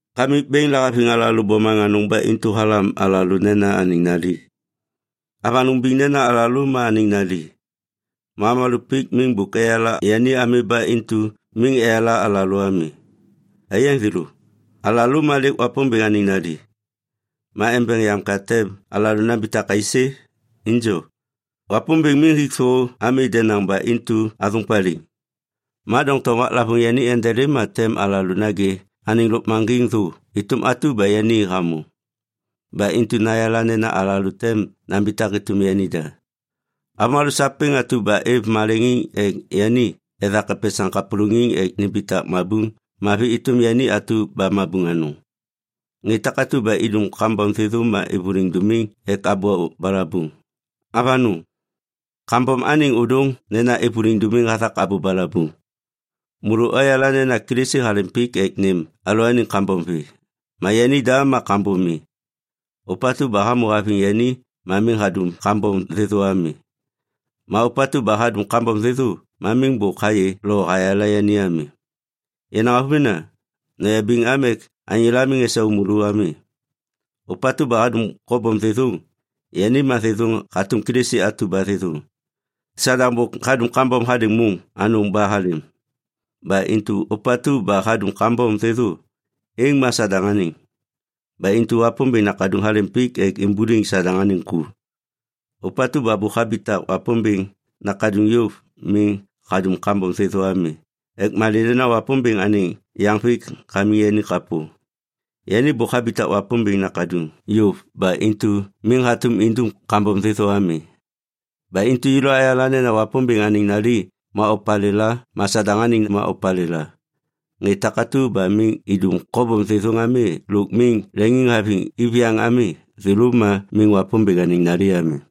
Kamik Bêŋ lahaviŋ alalô bomaŋ anôŋ ba intu halam alalô nena anêŋ nali. Avanôŋ biŋ nena alalô ma anêŋ nali. Ma avômalô pik miŋ bôk eyala yani ami ba intu miŋ eyala alalô ami. Aiyaŋ thêlô, alalô ma lêk Wapômbêŋ anêŋ nali. Ma embeŋ yam ka tem alalô nambitak aisê? Injo, Wapômbêŋ miŋ hik thô ami denaŋ ba intu athôŋ paliŋ. Ma doŋtom waklavôŋ yani endelêm ma tem alalô nagê anêŋ lôkmaŋgiŋ thô êtôm atu ba yani hamô. Ba intu nayala nena alalô tem nambitak êtôm yanida. Avômalô sapêŋ atu ba êv maleŋiŋ ek yani ethak epesaŋ kapôlôŋiŋ ek nimbitak mabuŋ mavi êtôm yani atu ba mabuŋ mavi. Ŋê takatu ba idum kambom thêthô ma êvôliŋ dômiŋ ek abô balabuŋ. Avanôŋ, kambom anêŋ ôdôŋ nena êvôliŋ dômiŋ hathak abô balabuŋ. Môlô oyala nena Kilisi halêm pik ek nêm alalôaniŋ kambom vê, ma yanida ma kambom mi. Ôpatu ba hamô haviŋ yani miŋ hadum kambom thêthô ami. Ma ôpatu ba hadum kambom thêthô miŋ bôk hayê lo hayala yani ami. Yenaŋ avômena, noyabiŋ am ek anyôla miŋ esau môlô ami. Ôpatu ba hadum kobom thêthôŋ, yani ma thêthôŋ hatôm Kilisi atu ba thêthôŋ. Sadaŋ bôk hadum kambom hadêŋ môŋ anôŋ ba halêm. Ba intu ôpatu ba hadum kambom thêthô, êŋ ma Sadaŋ anêŋ. Ba intu Wapômbêŋ Nakaduŋ halêm pik ek imbuliŋ Sadaŋ anêŋ ku. Ôpatu ba bôk habitak Wapômbêŋ nakaduŋ yôv miŋ hadum kambom thêthô ami ek malê nena Wapômbêŋ anêŋ yaŋvêk hamiŋ yani kapô. Yani bôk habitak Wapômbêŋ nakaduŋ yôv ba intu miŋ hatôm indum kambom thêthô ami. Ba intu yêlô ayala nena Wapômbêŋ anêŋ nali ma opalêla ma Sadaŋ anêŋ ma opalêla. Ŋê takatu ba miŋ idum kobom thêthôŋ ami lôk miŋ leŋiŋhaviŋ iviyaŋ ami, thêlô ma miŋ Wapômbêŋ anêŋ nali ami.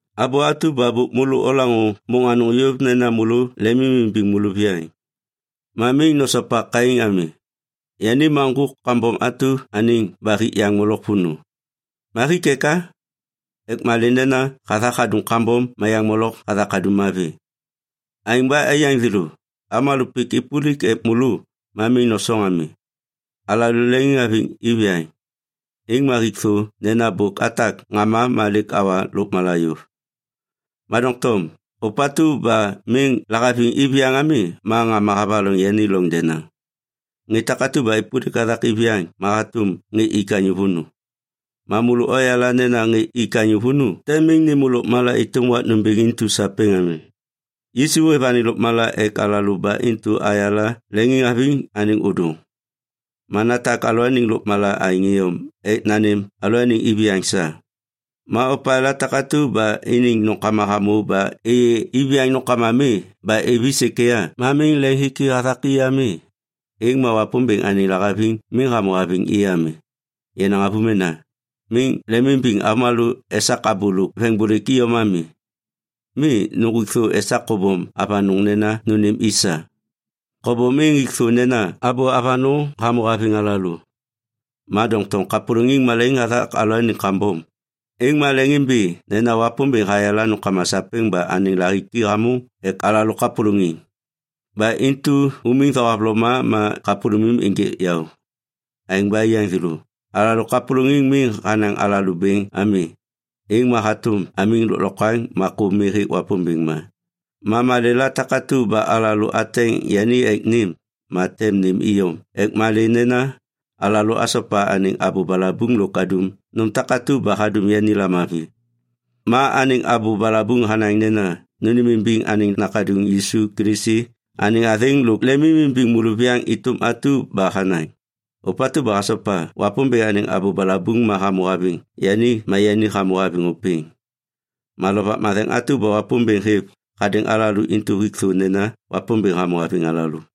Abô atu ba bôk môlô olaŋô môŋ anôŋ yôv nena môlô lemimimbiŋ môlôviyaŋ. Ma miŋ nosopa Kain ami. Yani ma ŋgôk kambom atu anêŋ ba hik yaŋ molok vônô. Ma hik eka? Ek malê nena hathak hadum kambom ma yaŋ molok hathak hadum mavi. Aêŋ ba aiyaŋ thêlô, avômalô pik êpôlik ek môlô ma miŋ nosoŋ ami. Alalô leŋiŋhaviŋ iviyaŋ, êŋ ma hik thô nena bôk atak ŋama ma lêk awa lôkmala yôv. Ma doŋtom ôpatu ba miŋ lahaviŋ iviyaŋ ami ma ŋama havaloŋ yani loŋ denaŋ. Ŋê takatu ba êpôlik hathak iviyaŋ ma hatôm ŋê ik anyô vônô. Ma môlô oyala nena ŋê ik anyô vônô tem miŋ nêmô lôkmala êtôm wak nômbêŋ intu sapêŋ ami. Yisu hêv anêŋ lôkmala ek alalô ba intu ayala leŋiŋhaviŋ anêŋ ôdôŋ. Ma natak alalôaniŋ lôkmala aêŋ iyom ek nanêm alalôaniŋ iviyaŋ sa. Ma opalêla takatu ba iniŋ nômkama hamô ba êyê iviyaŋ nômkama mi ba êv i sêkêya ma miŋ leŋhiki hathak i ami, êŋ ma Wapômbêŋ anêŋ lahaviŋ miŋ hamô haviŋ i ami. Yenaŋ avômena, miŋ lemimbiŋ avômalô esak abô lôk veŋbôlêk iyom ami. Mi, nuŋgwik thô esak kobom avanôŋ nena nônêm i sa. Kobom êŋ hik thô nena abô avanôŋ hamô haviŋ alalô. Ma doŋtom kapôlôŋiŋ malaiŋ hathak alalôaniŋ kambom, êŋ ma leŋimbi nena Wapômbêŋ hayala nômkama sapêŋ ba anêŋ lahiki hamôŋ ek alalô kapôlôŋiŋ. Ba intu umiŋ thohavloma ma kapôlômim ênjêk yaô. Aêŋ ba aiyaŋ thêlô, alalô kapôlôŋiŋ miŋ hanaŋ alalô bêŋ ami, êŋ ma hatôm amiŋ lôklokwaŋ ma kô mi hêk Wapômbêŋ ma. Ma malêla takatu ba alalô ateŋ yani ek nêm, ma tem nêm iyom ek malê nena alalô asopa anêŋ abô balabuŋ lôk adum nôm takatu ba hadum yani lamavi. Ma anêŋ abô balabuŋ hanaŋ nena nônêmimbiŋ anêŋ Nakaduŋ Yisu Kilisi anêŋ athêŋ lôk lemimimbiŋ môlôviyaŋ êtôm atu ba hanaŋ. Ôpatu ba hasopa Wapômbêŋ anêŋ abô balabuŋ ma hamô haviŋ yani ma yani hamô haviŋ ôpêŋ. Ma Lovak Matheŋ atu ba Wapômbêŋ hêv hadêŋ alalô intu hik thô nena Wapômbêŋ hamô haviŋ alalô.